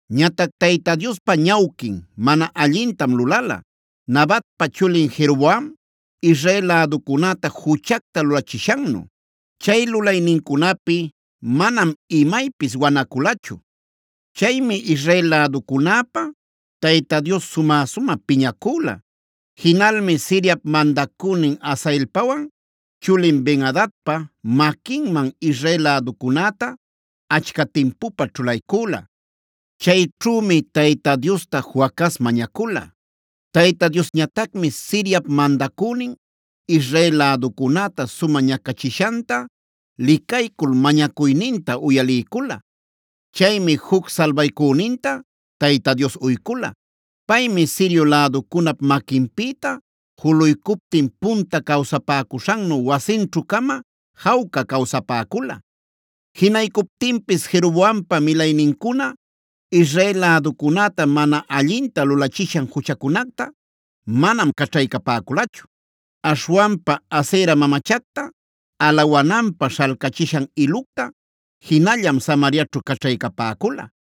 Ñatac Tayta Diospa ñawquin mana allintam lulala Nabatpa chulin Jeroboam Israel läducunäta juchacta lulachishannu. Chay lulaynincunapi manam imaypis wanaculachu. Chaymi Israel läducunäpä Tayta Dios sumä-sumä piñacüla. Jinalmi Siriap mandacünin Hazaelpawan chulin Ben-adadpa maquinman Israel läducunäta achca timpupä ćhulaycüla. Chayćhümi Tayta Diosta Joacaz mañacula. Tayta Diosñatacmi Siriap mandacünin Israel läducunäta sumä ñacachishanta licaycul mañacuyninta uyaliycula. Chaymi juc salbaycüninta Tayta Dios uycula. Paymi Sirio läducunap maquinpïta juluycuptin punta cawsapäcuśhannu wasinćhu-cama jawca cawsapäcula. Jinaycuptinpis Jeroboampa milaynincuna Israel läducunäta mana allinta lulachishan juchacunacta manam caćhaycapäculachu. Aśhwanpa Asera mamachacta alawananpä śhalcachishan ilucta jinallam Samariaćhu caćhaycapäcula.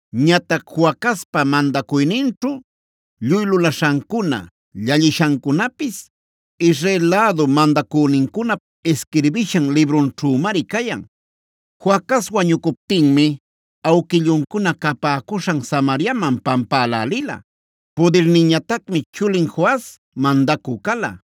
Ñatac Joacazpa mandacuyninćhu lluy lulaśhancuna, llallishancunapis Israel lädu mandacünincunap isquirbishan librunćhümari cayan. Joacaz wañucuptinmi awquilluncuna capäcuśhan Samariaman pampälälila. Pudirninñatacmi chulin Joas mandacü cala.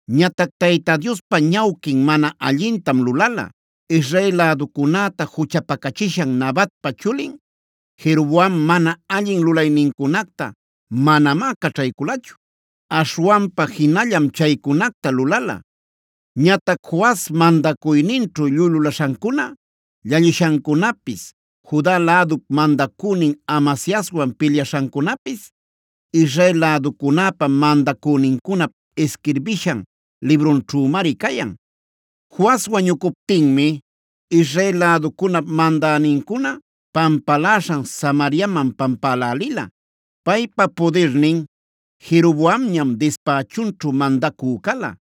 Ñatac Tayta Diospa ñawquin mana allintam lulala. Israel läducunäta juchapacachishan Nabatpa chulin Jeroboam mana allin lulaynincunacta manamá caćhayculachu. Aśhwanpa jinallam chaycunacta lulala. Ñatac Joas mandacuyninćhu lluy lulaśhancuna, llallishancunapis, Juda lädup mandacünin Amasiaswan pilyaśhancunapis Israel läducunäpa mandacünincunap isquirbishan librunćhümari cayan. Joas wañucuptinmi Israel läducunap mandänincuna pampaläśhan Samariaman pampälälila. Paypa pudirnin Jeroboamñam dispächunćhu mandacü cala.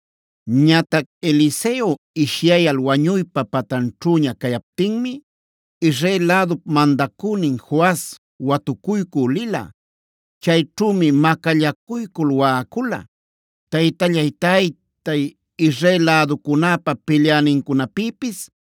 Ñatac Eliseo ishyayal wañuypa patanćhüña cayaptinmi Israel lädup mandacünin Joas watucuycü lila. Chayćhümi macallacuycul waꞌacula: “Taytallay, taytay, Israel läducunäpa pilyänincunapïpis,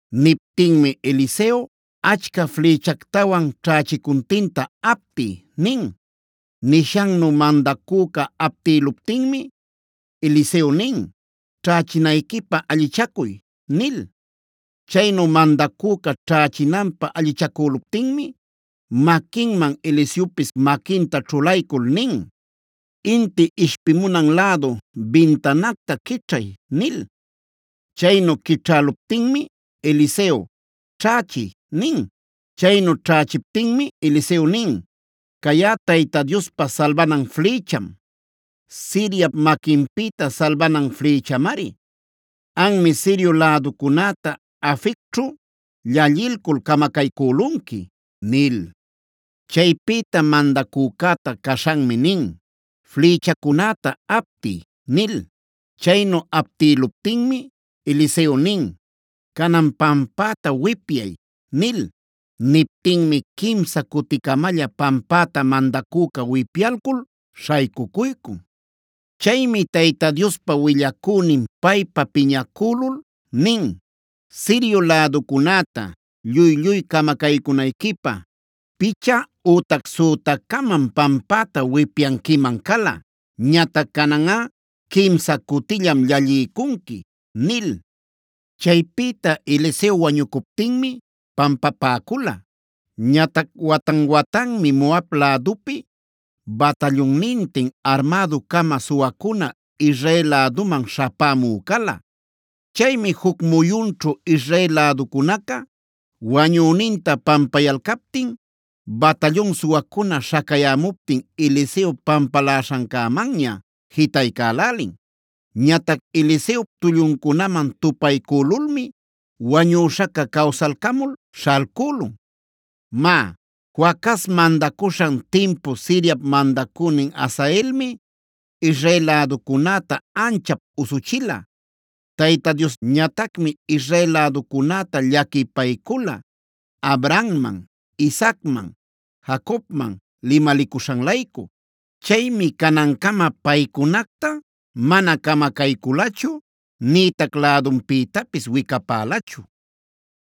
Niptinmi Eliseo: “Achca flïchactawan ćhächicuntinta aptiy” nin. Nishannu mandacüca aptïluptinmi, Eliseo nin: “Ćhächinayquipä allichacuy” nil. Chaynu mandacüca ćhächinanpä allichacüluptinmi manquinman Eliseopis maquinta ćhulaycul nin: “Inti ishpimunan lädu bintanacta quićhay” nil. Chaynu quićhäluptinmi Eliseo: “Ćhächiy” nin. Chaynu ćhächiptinmi Eliseo nin: “Cayꞌa Tayta Diospa salbanan flïcham. Siriap maquinpïta salbanan flïchamari. Anmi Sirio läducunäta Afecćhu llallilcul camacaycülunqui” nil. Chaypïta mandacücäta caśhanmi nin: “Flïchacunäta aptiy” nil. Chaynu aptïluptinmi Eliseo nin: “Canan pampäta wipyay” nil. Niptinmi quimsa cuticamalla pampäta mandacüca wipyalcul śhaycucuycun. Chaymi Tayta Diospa willacünin paypa piñäcülul nin: “Sirio läducunäta lluy-lluy camacaycunayquipä picha ütac sütacamam pampäta wipyanquiman cala. Ñatac cananꞌa quimsa cutillam llalliycunqui” nil. Chaypïta Eliseo wañucuptinmi pampapäcula. Ñatac watan-watanmi Moab lädupi batallunnintin armädu-cama suwacuna Israel läduman śhapämü cala. Chaymi juc muyunćhu Israel läducunaca wañüninta pampayalcaptin batallun suwacuna śhacayämuptin Eliseo pampaläśhancämanña jitaycälälin. Ñatac Eliseop tulluncunaman tupaycülulmi wañüśhaca cawsalcamul śhalcülun. Má, Joacaz mandacuśhan timpu Siriap mandacünin Hazaelmi Israel läducunäta anchap usuchila. Tayta Diosñatacmi Israel läducunäta llaquipaycula Abrahamman, Isaacman, Jacobman limalicuśhan-laycu. Chaymi canancama paycunacta mana camacayculachu nïtac lädunpïtapis wicapälachu.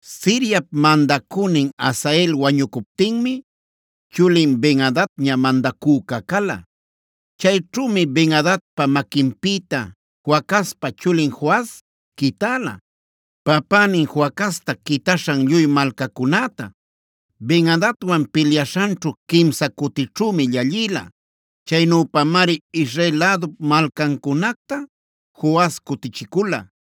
Siriap mandacünin Hazael wañucuptinmi chulin Ben-adadña mandacüca cala. Chayćhümi Ben-adadpa maquinpïta Joacazpa chulin Joas quitäla, papänin Joacazta quitaśhan lluy malcacunäta. Ben-adadwan pilyaśhanćhu quimsa cutićhümi llallïla. Chaynüpamari Israel lädup malcancunacta Joas cutichicula.